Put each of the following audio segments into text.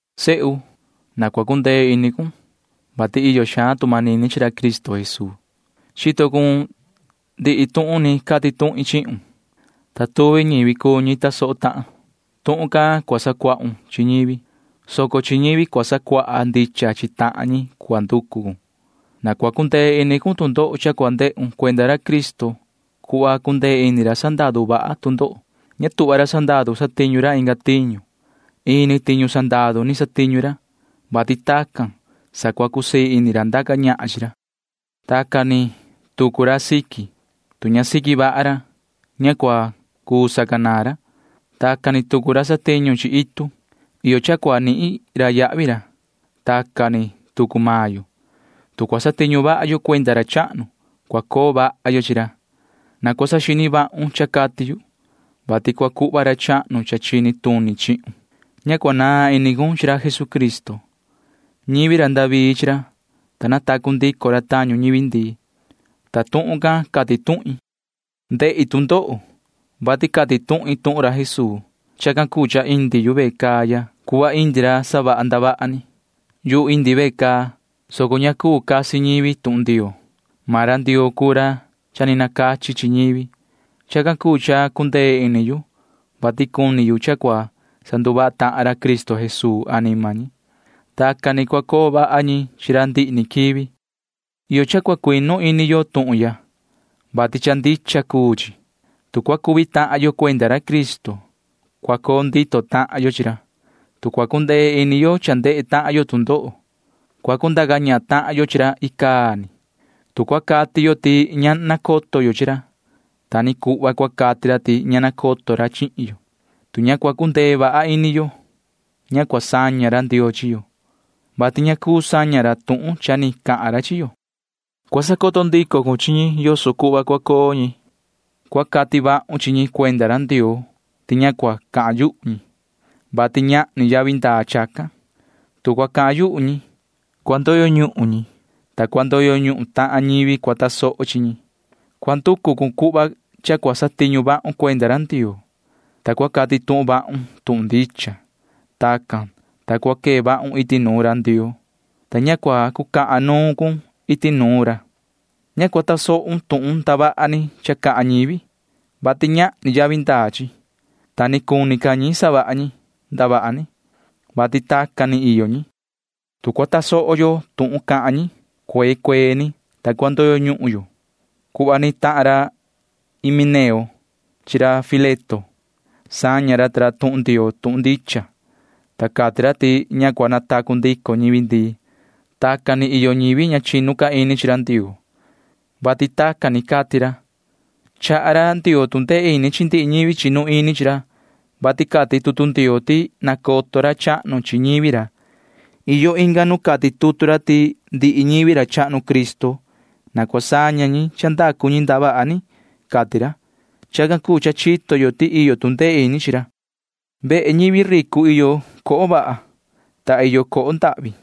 Sehu, na cua cundee ini cun, vati iyo xaan tu manini chi ra Cristo Jesuu. Chito cun ndihi tuhun ni cati tuhin chihun, ta tuvi ñivi cuu ñi tasoho tahan. Tuhun can cua sacuahun chi ñivi, soco chi ñivi cua sacuaha ndicha chi tahan ñi cua nducu cun. Na cua cundee ini cun tu ndoho cha cua ndehun cuenda ra Cristo cuhva cundee ini ra sandaru vaha tu ndoho. Ña tuhva ra sandaru satiñu ra inga tiñu. Ini tiñu sandaru ni satiñu ra, vati tacan sa cusii ini ra ndaca ñahan chi ra. Tacan ni tucu ra siqui―tu ña siqui vaha ra, ña cua cuu sacanaan ra. Tacan ni tucu ra satiñu chi itu―iyo cha cua nihin ra yahvi ra. [Tacan ni tucu maan yo―tu cua satiñu vaha yo cuenda ra chahnu, cua coo vaha yo chi ra.] Na cua saxini vahun cha cati yu, vati cua cuhva ra chahnu cha chini tuni chihun. Ña cua naan ini cun chi ra Jesucristo. Ñivi ra David chi ra, ta natacu ndico ra tañu ñivi ndii, ta tuhun can cati tuhin. Ndehi tu ndoho, vati cati tuhin tuhun ra Jesuu. Chacan cuu cha indi yu ve caa ya cuhva indi ra savaha ndavaha ni. Yuhu indi ve caa, soco ña cuu casi ñivi tuhun Ndioo. Maan ra Ndioo cuu ra cha ni nacachi chi ñivi. Chacan cuu cha cundee ini yu, vati cuni yu cha cua sanduvaha tahan ra Cristo Jesuu anima ñi. Tacan ni cua coo vaha ñi chi ra ndihi ni quivi. Iyo cha cua cuinu ini yo tuhun ya, vati cha ndicha cuu chi. Tu cua cuvi tahan yo cuenda ra Cristo, cua coo ndito tahan yo chi ra. Tu cua cundee ini yo cha ndehe tahan yo tu ndoho, cua cundaca ñahan tahan yo chi ra icaa ni. Tu cua cati yo ti ña nacoto yo chi ra, ta ni cuhva cua cati ra ti ña nacoto ra chihin yo. Tu ña cua cundee vaha ini yo, ña cua saña ra Ndioo chi yo, vati ña cuu saña ra tuhun cha ni cahan ra chi yo. Cua sacoto ndico cun chi ñi yoso cuhva cua coo ñi. Cua cati vahun chi ñi cuenda ra Ndioo ti ña cua cahan yuhu ñi, vati ñahni yavi ndaa chacan. Tu cua cahan yuhu ñi, cua ndoyo ñuhun maan ñi, ta cua ndoyo ñuhun tahan ñivi cua tasoho chi ñi. Cua nducu cun cuhva cha cua satiñu vahun cuenda ra Ndioo, ta cua cati tuhun vahun tuhun ndicha. Tacan, ta cua quee vahun iti nuun ra Ndioo, ta ña cua cucahan nuun cun iti nuun ra. Ña cua tasohun tuhun ndavaha ni cha cahan ñivi, vati ñahni yavi ndaa chi, ta ni cuni ca ñi savaha ñi ndavaha ni, vati tacan ni iyo ñi. Tu cua tasoho yo tuhun cahan ñi, cuee cuee ni, ta cua ndoyo ñuhun yo cuhva ni tahan ra Himeneo chi ra Fileto. Saña ra ta ra tuhun Ndioo tuhun ndicha, ta cati ra ti ña cua natacu ndico ñivi ndii. Tacan ni iyo ñivi ña chinu ca ini chi ra Ndioo, vati tacan ni cati ra. Chaha ra Ndioo tu ndee ini chi ndihi ñivi chinu ini chi ra, vati cati tutu Ndioo ti nacoto ra chahnu chi ñivi ra. Iyo inga nu cati tutu ra ti ndihi ñivi ra chahnu Cristo―na cua saña ñi cha ndacu ñi ndavaha ni, cati ra. [Chacan cuu cha chito yo ti iyo tu ndee ini chi ra.] Vehe ñivi ricu iyo coho vaha, ta iyo coho ndahvi.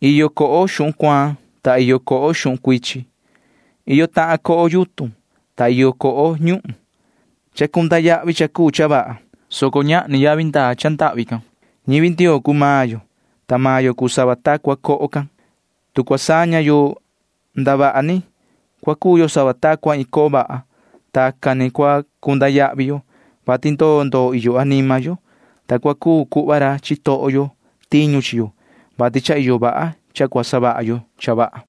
Iyo coho xuhun cuaan, ta iyo coho xuhun cuichin. Iyo tahan coho yutun, ta iyo coho ñuhun. Chacunda yahvi cha cuu cha vaha, soco ñahni yavi ndaa cha ndahvi can. [Ñivi Ndioo cuu maan yo, ta maan yo cuu sava ta cua coho can.] Tu cua saña yo ndavaha ni, cua cuu yo sava ta cua iin coho vaha. Tacan ni cua cunda yahvi yo, vati ndoo ndoo iyo anima yo, ta cua cuu cuhva ra chitoho yo tiñu chi yo, vati cha iyo vaha cha cua savaha yo cha vaha.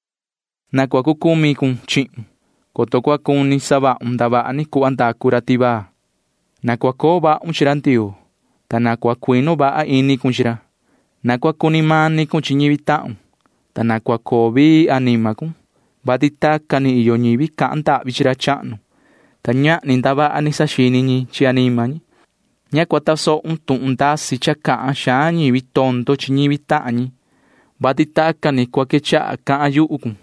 Na cua cu cumi cun chihun, coto cua cuni savahun ndavaha ni cuhva ndacu ra tivaa. Na cua coo vahun chi ra Ndioo, ta na cua cuinu vaha ini cun chi ra. Na cua cuni mani cun chi ñivi tahun, ta na cua coo vii anima cun, vati tacan ni iyo ñivi cahan ndahvi chi ra chahnu, ta ñahni ndavaha ni saxini ñi chi anima ñi. Ña cua tasohun tuhun ndasi cha cahan xaan ñivi tondo chi ñivi tahan ñi, vati tacan ni cua quechaha cahan yuhu cun.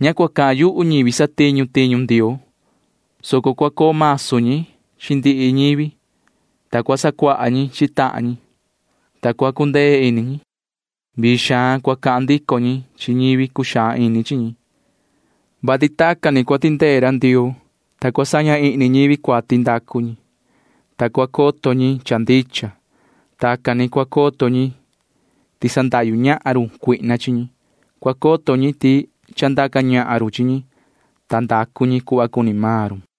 Ña cua cahan yuhu ñivi satiñu tiñu Ndioo, soco cua coo masu ñi chi ndihi ñivi, ta cua sacuaha ñi chi tahan ñi, ta cua cundee ini ñi. Vii xaan cua cahan ndico ñi chi ñivi cuxaan ini chi ñi. Vasi tacan ni cua tindee ra Ndioo, ta cua saña ihni ñivi cuati ndacu ñi, ta cua coto ñi cha ndicha. Tacan ni cua coto ñi ti sandahyu ñahan run cuihna chi ñi. Cua coto ñi ti cha ndaca ñahan run chi ñi, ta ndacu ñi cuhva cuni maan run.